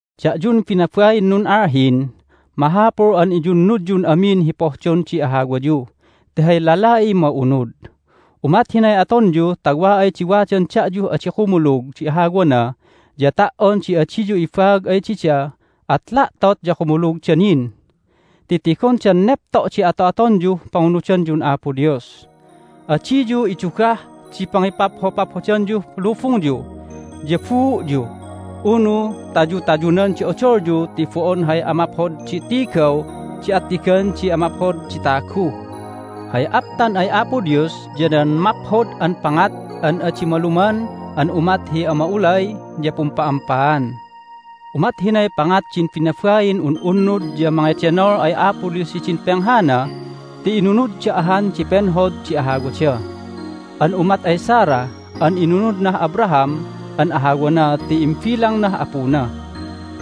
Da'yun binabain nun'alhin, mahapul an iyunnudyun amin hi pohdon di ahawayu ti hay lala'iy ma'unud. Umat hinay atonyu ta wa ay di wadan da'yuh adi kumulug di ahawana ya ta"on di adiyu ibaag ay dida at la'tot ya kumulugda nin ti tigondan nepto' di ato'atonyuh pangunudanyun Apo Dios. Adiyu idugah di pangipaphopaphodanyuh lubungyu ya buu'yu unu tayutayunan di odolyu ti bo'on hay amaphod di tigaw di attigan di amaphod di tagu. Hay aptan ay Apo Dios ya nan maphod an pangat an adi maluman an umat hi ama'ulay ya pumpa'ampaan. Umat hinay pangat din binabain un'unnud ya mangedenol ay Apo Dios hidin penghana ti inunudda ahan di penhod di ahawada an umat ay Sarah an inunudnah Abraham an ahawana ti imbilangnah apuna.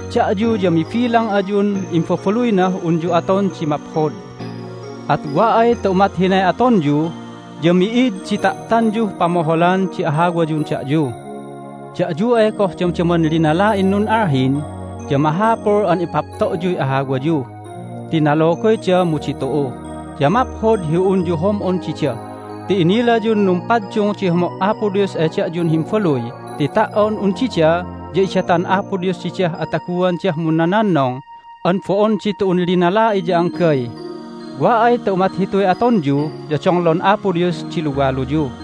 Da'yu ya mibilang ayun imbabaluynah unyu aton di maphod. At wa ay ta umat hinay atonyu ya mi'id di ta'tanyuh pamoholan di ahawayun da'yu. Da'yu ay goh damdaman linala'in nun'alhin ya mahapul an ipapto'yuy ahawayu ti nalogoyda mu ditu'u. Ya maphod hi unyu hom'on dida ti inilayun numpaddung di homo' Apo Dios ay da'yun himbaluy ti ta"on un dida ya idatan Apo Dios didah ataguandah munnononnong an bo'on ditu'un linala'i ya anggay. Wa ay ta umat hituy atonyu ya donglon Apo Dios di luwaluyu.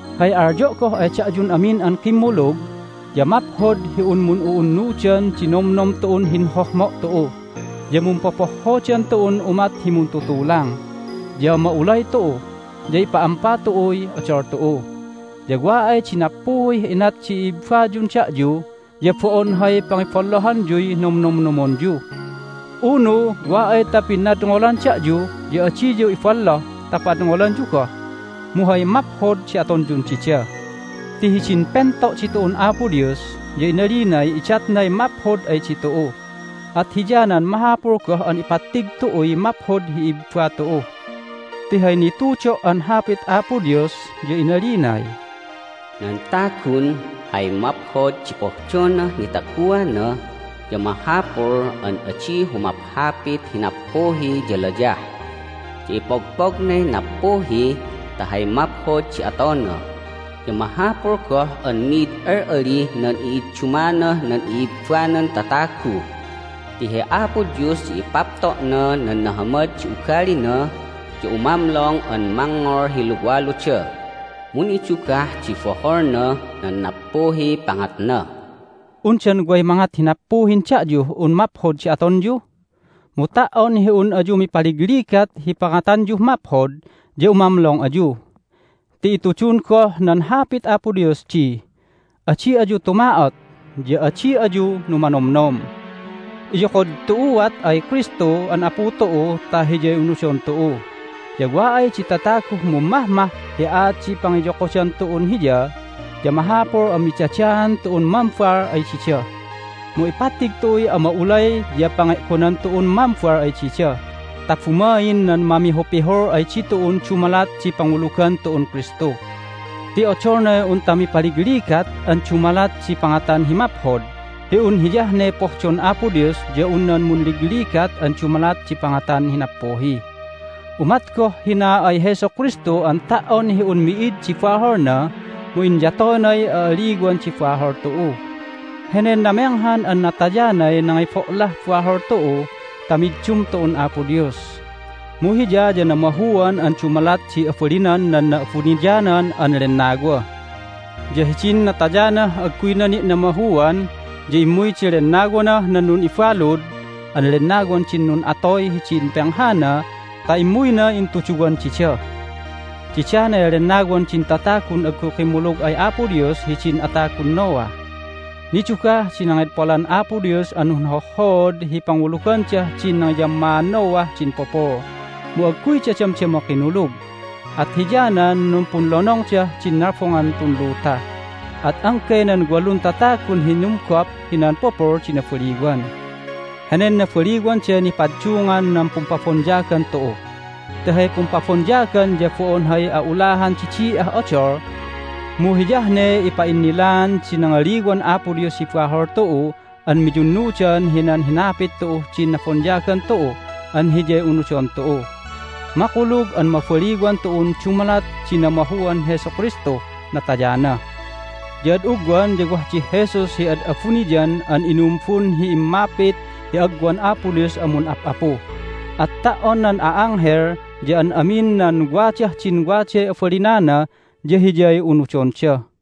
Hay alyo' goh ay da'yun amin an kimmulug ya maphod hi un mun'u'unnudan di nomnom tu'un hinhohmo' tu'u, ya mumpopohhodan tu'un umat hi muntutulang, ya ma'ulay tu'u, ya ipa'ampa tu'uy odol tu'u. Ya wa ay di nappuhih inat di i'ibbayun da'yu ya bo'on hay pangiballohanyuy nomnomnomonyu. Unu wa ay ta pinadngolan da'yu ya adiyu iballoh ta padngolanyu goh, mu hay maphod di atonyun dida. Ti hidin pento' ditu'un Apo Dios ya inalinay idatnay maphod ay ditu'u, at hiyanan mahapul goh an ipattig tu'uy maphod hi i'ibba tu'u. Ti hay nitudo' an Hapit Apo Dios ya inalinay, "Nan tagun hay maphod di pohdonah nitaguana ya mahapul an adi humaphapit hi nappuhi ya layah. Ya ipogpognay nappuhi ta hay maphod di atona, ya mahapul goh an mi'id al'alih nan i'iddumanah nan i'ibbanan tatagu. Ti hi Apo Dios ya ipapto'na nan nahamad di ugalina, ya umamlong an mangngol hi luwaluda, mu nidugah di boholnah nan nappuhiy pangatna." Undan way mangat hi nappuhin da'yuh un maphod di atonyu? Mu ta"on hi un ayu mipaligligat hi pangatanyuh maphod ya umamlong ayu! Ti itudun goh nan Hapit Dios di, "Adi ayu tuma'ot, ya adi ayu numanomnom." Iyokod tu'uat ay Kristu an Apu tu'u ta Hiyay unudon tu'u. Ya wa ay di tataguh mummahmah hi aat di pangiyokodan tu'un Hiya ya mahapul an midadaan tu'un mambal ay dida. Mu ipattig tu'uy ama'ulay ya pange'gonan tu'un mambal ay dida ta bumain nan mamihupihul ay ditu'un dumalat di pangulugan tu'un Kristu. Ti odolnay unta mipaligligat an dumalat di pangatan hi maphod hi un hiyah ne pohdon Apo Dios ya un nan munligligat an dumalat di pangatan hi nappuhi. Umat goh hina ay Jesu Kristu an ta"on hi un mi'id di baholna mu inyatoynay a'aliwan di bahol tu'u. Henen namenghan an natayanay nangibo'lah bahol tu'u ta middum tu'un Apo Dios, mu Hiya ya namahuan an dumalat di abalinan nan Na'abuniyanan an Lennawa. Ya hidin natayanah agguyna ni' namahuan ya immuy di lennawanah nan nun'ibalud an lennawan din nun'atoy hidin penghana ta immuyna intuduwan dida. Didanay lennawan din tatagun agguy kimmulug ay Apo Dios hidin atagun Noah. Nidugah di nangedpolan Apo Dios an nunhohhood hi pangulugandah din nangiyammaan Noah din pupul, mu agguyda damdama kinulug. At hiyanan numpunlonongdah din nalbongan tun luta, at anggay nan walun tatagun hinumgop hinan pupul di nabaliwan. Henen nabaliwanday nipaddungan nan pumpabonyagan tu'u. Ti hay pumpabonyagan ya bo'on hay a'ulahan di di'ah odol, mu hiyah ne ipa'innilaan di nangaliwan Apo Dios hi bahol tu'u an miyunnudan hinan hinapit tu'uh din nabonyagan tu'u an Hiyay unudon tu'u. Makulug an mabaliwan tu'un dumalat di namahuan Jesu Kristuh natayana. Ya ad ugwan ya wah dih Jesus hi ad abuniyan an inumbun hi immapit hi agwan Apo Dios an mun'ap'apu. At ta"on nan a'anghel ya an amin nan wadah din waday abalinana ya Hiyay unudonda.